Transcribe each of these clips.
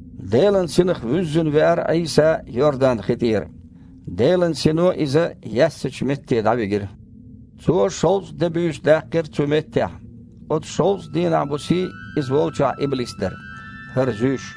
Делан Синах вуьззина веара Іийса Йордан-хи тІера. Делан Сино Иза яьссачу метте дІавигира. Цо шовзткъа де-буьйса даьккхира цу меттехь. Оцу шовзткъа дийнахь-бусий Иза волчохь иблис дара, ХІара зуьйш.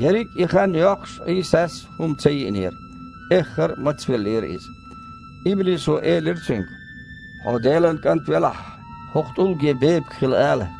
Ерриг и хан йоккхуш Іийсас хІума ца йиънера. Эххар а мацвеллера Иза. Иблисо элира Цуьнга: «Хьо Делан КІант велахь, хІокху тІулге бепиг хила ала».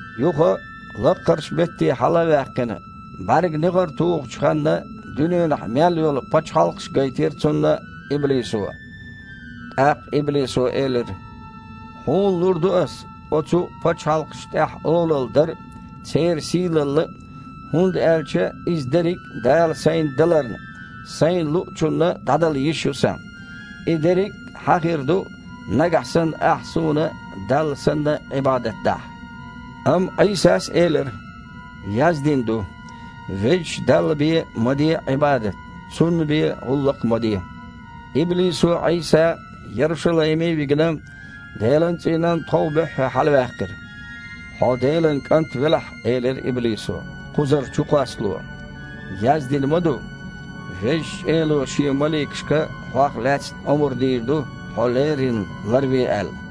Юха, лаккхарчу метте хьала а ваьккхина, бІаьрган негІар тухучу ханна дуьненахь мел йолу пачхьалкхаш гайтира Цунна иблисо. ТІаккха иблисо элира: «Хьуна лур ду ас оцу пачхьалкхашна тІехь олалла дар а, церан сийлалла а, хІунда аьлча иза дерриг а Дала сайна даларна, сайна луучунна дІадала йиш ю сан. И дерриг Хьан хир ду, нагахь санна Ахь суна, Далла санна, Іибадат дахь». Амма Іийсас элира: «Яздина ду: „Везачу Далла бен ма де Іибадат, Цунна бен гІуллакх а ма де!“» Иблисо Іийса Ярушалайме а вигина, Делан цІийнан тхов буьххье хьалаваьккхира. «Хьо Делан КІант велахь, – элира иблисо, – кхузара чукхоссало. Яздина ма ду: „Дала шен маликашка Хьох лаьцна омра дийр ду, Хьо леррина ларве“ – аьлла.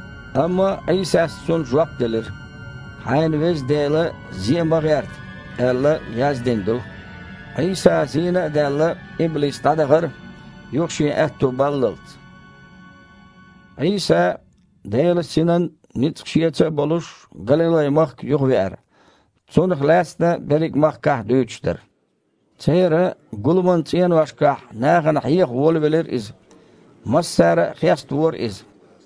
Амма Іийсас цунна жоп делира: «„Хьайн Веза Дела зе ма гІерта“, – аьлла, яздина ду». Іийса зийна а даьлла, иблис дІадахара, юха шен аьтто баллалц. Іийса, Делан Синан ницкъ Шеца болуш, Галилай-махка юхавеара. Цунах лаьцна берриг махкахь дуьйцуш дара. Церан гуламан цІеношкахь нахана хьеха волавелира Иза. Массара а хеставора Иза.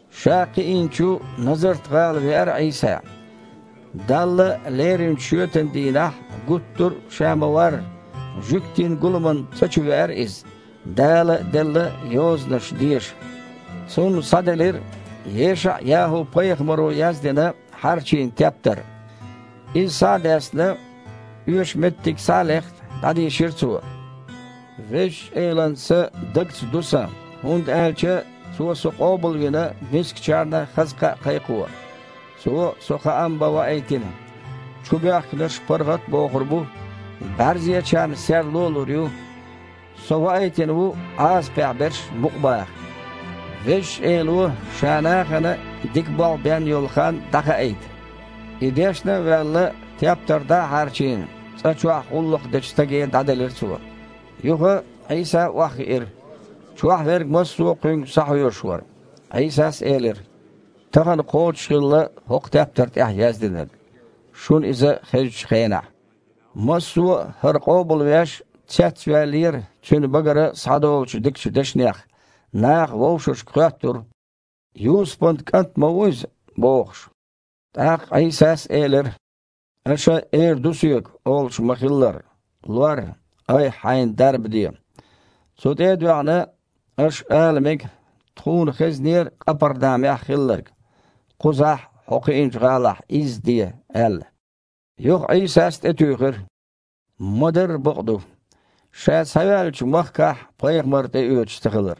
Ша кхиинчу Назарт-ГІала веара Іийса. Далла леринчу шоьтан дийнахь, гуттар а Ша ма-варра, жуьгтийн гуламан цІа чу веара Иза, Дала делла Йозанаш деша. Цунна схьаделира ЕшаІ-ЯхІу-пайхамаро яздина, хьарчийна тептар. И схьа а даьстина, оьшу меттиг схьа а лехна, дІадийшира Цо: «Везачу Элан Са дагца ду Сан. Цо со къобалвина дела, мискачу нахана Шех лаьцна хаза кхаъ бан. Цо со хаам бан ваийтина: чубоьхкинарш паргІат а бохур бу, бІаьрзечарна серло а лур ю. Со ваийтина ву Іазапехь берш мукъабаха, Везачу Эло Ша нахана дика болх бен йолу хан дІахаийта». И дешна а ваьлла, тептар дІа а хьарчийна, цІа чохь гІуллакх дечу стаге дІаделира Цо. Юха Іийса охьахиира. Чохь верг массо а Кхуьнга схьахьоьжуш вара. Іийсас элира: «Тахана кхочушхилла хІокху тептар тІехь яздинарг, шуна иза хезачу хенахь». Массо а, ХІара къобалвеш, цецваьллера Цуьнан багара схьадолучу дикачу дешнех. Наха вовшашка хоьттура: «Юсупан кІант ма ву Иза?» – бохуш. ТІаккха Іийсас элира: «Аша эр ду Соьга, олуш ма-хиллара: „Лор, айхьа-хьайна дарба де“. Цу тІе а доьгІна, аш ала мега: „Тхуна хезнера Къапарнамехь хилларг. Кхузахь, Хьо кхиинчу гІалахь, изза де“, – аьлла». Юха Іийсас тІетуьйхира: «Ма-дарра бакъ ду: ша схьаваьллачу махкахь пайхамар тІеоьцуш ца хилар.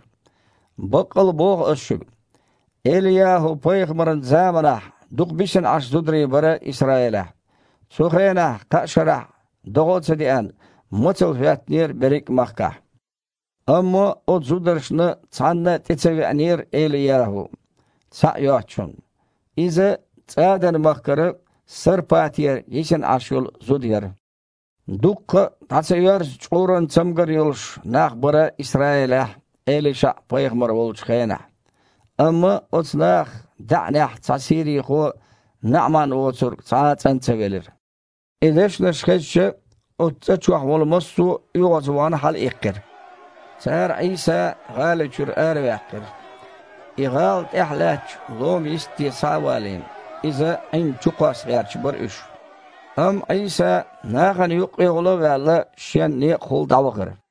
Баккъал боху Ас шуьга: ЭлияхІу-пайхамаран заманахь дукха бисина Іаш зударий бара Исраилехь. Цу хенахь кхаа шарахь догІа а ца деана, мацалла хІоьттинера берриг а махкахь. Амма оцу зударшна цхьанна а тІе ца веанера ЭлияхІу, цхьаъ йоцучунна. Иза ЦІадан-махкара Сарпатера йисина Іаш йолу зуда яра. Дуккха а дІа ца йоьрзу чкъуран цамгар йолуш нах бара Исраилехь ЭлишаІ-пайхамар волчу хенахь. Амма оцу нахах даьІнех цхьа сирийхо НаІаман воцург цхьа а цІан ца велира». И дешнаш хезча, оцу цІа чохь волу массо а, оьгІазвахана, хьалаиккхира. Цара Іийса гІали чуьра араваьккхира. И гІала тІехь лаьттачу лома йистте схьа а валийна, Иза Іинна чукхосса гІерташ бара уьш. Амма Іийса, нахана юккъехула а ваьлла, Шен некъахула дІавахара.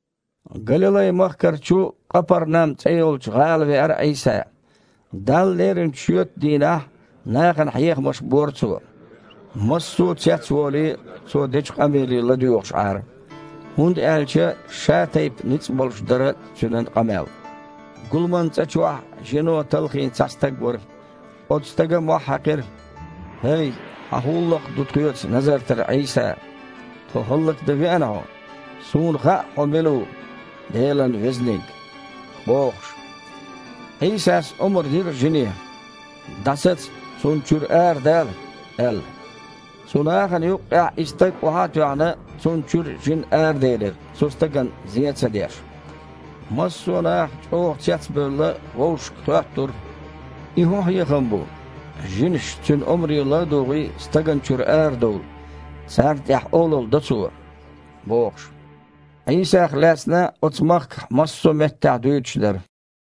Галилай-махкарчу Къапарнам цІе йолчу гІала веара Іийса. Далла леринчу шоьтан дийнахь нахана хьехамаш бора Цо. Массо а, цецволий, Цо дечу къамеле ладоьгІуш Іара, хІунда аьлча шатайпа ницкъ болуш дара Цуьнан къамел. Гуламан цІа чохь жинаша талхийна цхьа стаг вара. Оцу стага мохь хьаькхира: «ХІей, Хьан хІун гІуллакх ду тхоьца Назартара Іийса? Тхо хІаллакдан веана Хьо? Суна хаьа Хьо мила ву – Делан Везаниг!» – бохуш. Іийсас омра дира жине: «ДІасаца! Цунна чуьра арадала!» – аьлла. Цу нахана юккъехь и стаг охьа а тоьхна, цунна чуьра жин араделира, цу стагана зен а ца деш. Массо а наха, чІогІа цецбевлла, вовшашка хоьттура: «И хІун хьехам бу? Жинаш, Цуьнан омре ладугІий, стагана чуьра арадовлу. Царна тІехь олалла до Цо», – бохуш. Іийсах лаьцна оцу махкахь массо а меттехь дуьйцуш дара.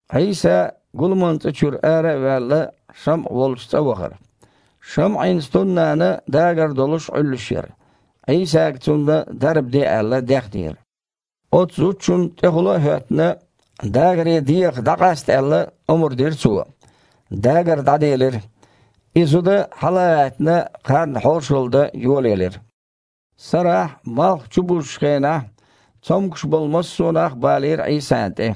Іийса, гуламан цІа чуьра ара а ваьлла, ШамІа волчу цІа вахара. ШамІин стуннана дагар долуш Іуьллуш яра. Іийсага цунна дарба де аьлла, дехнера. Оцу зудчунна тІехула а хІоьттина, дагаре дегІах дІакъаста аьлла, омра дира Цо. Дагар дІаделира, и зуда, хьала а гІаьттина, кхарна хьошалла дан йолаелира. Сарахь, малх чубузучу хенахь, цомгуш болу массо а нах балийра Іийсана тІе.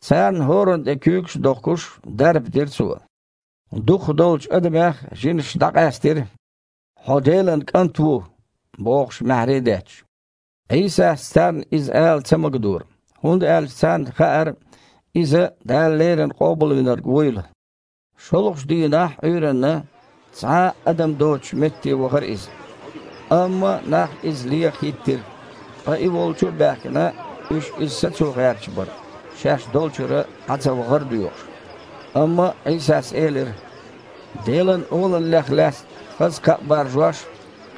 Царна хІоранна тІе куьйгаш а дохкуш, дарба дира Цо. Дукхахдолчу адамех жинаш дІакъаьстира: «Хьо Делан КІант ву!» – бохуш, маьхьарий а детташ. Іийсас царна иза ала ца магадора, хІунда аьлча царна хаьара Иза, Дала леррина Къобалвинарг вуйла. ШолгІачу дийнахь, Іуьйранна, цхьа а адам доцучу метте вахара Иза. Амма нах Иза леха хІиттира, ткъа И волчу а баьхкина, уьш Иза сацо гІерташ бара, шаьш долчуьра дІацавахар а доьхуш. Амма Іийсас элира: «Делан Олаллех лаьцна хаза кхаъ баржош,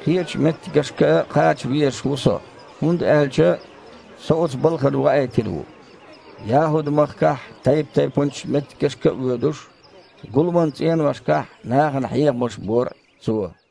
кхечу меттигашка а кхача везаш ву Со, хІунда аьлча Со оцу балхана ваийтина ву». ЯхІуд-махкахь тайп-тайпанчу меттигашка а воьдуш, гуламан цІеношкахь нахана хьехамаш бора Цо.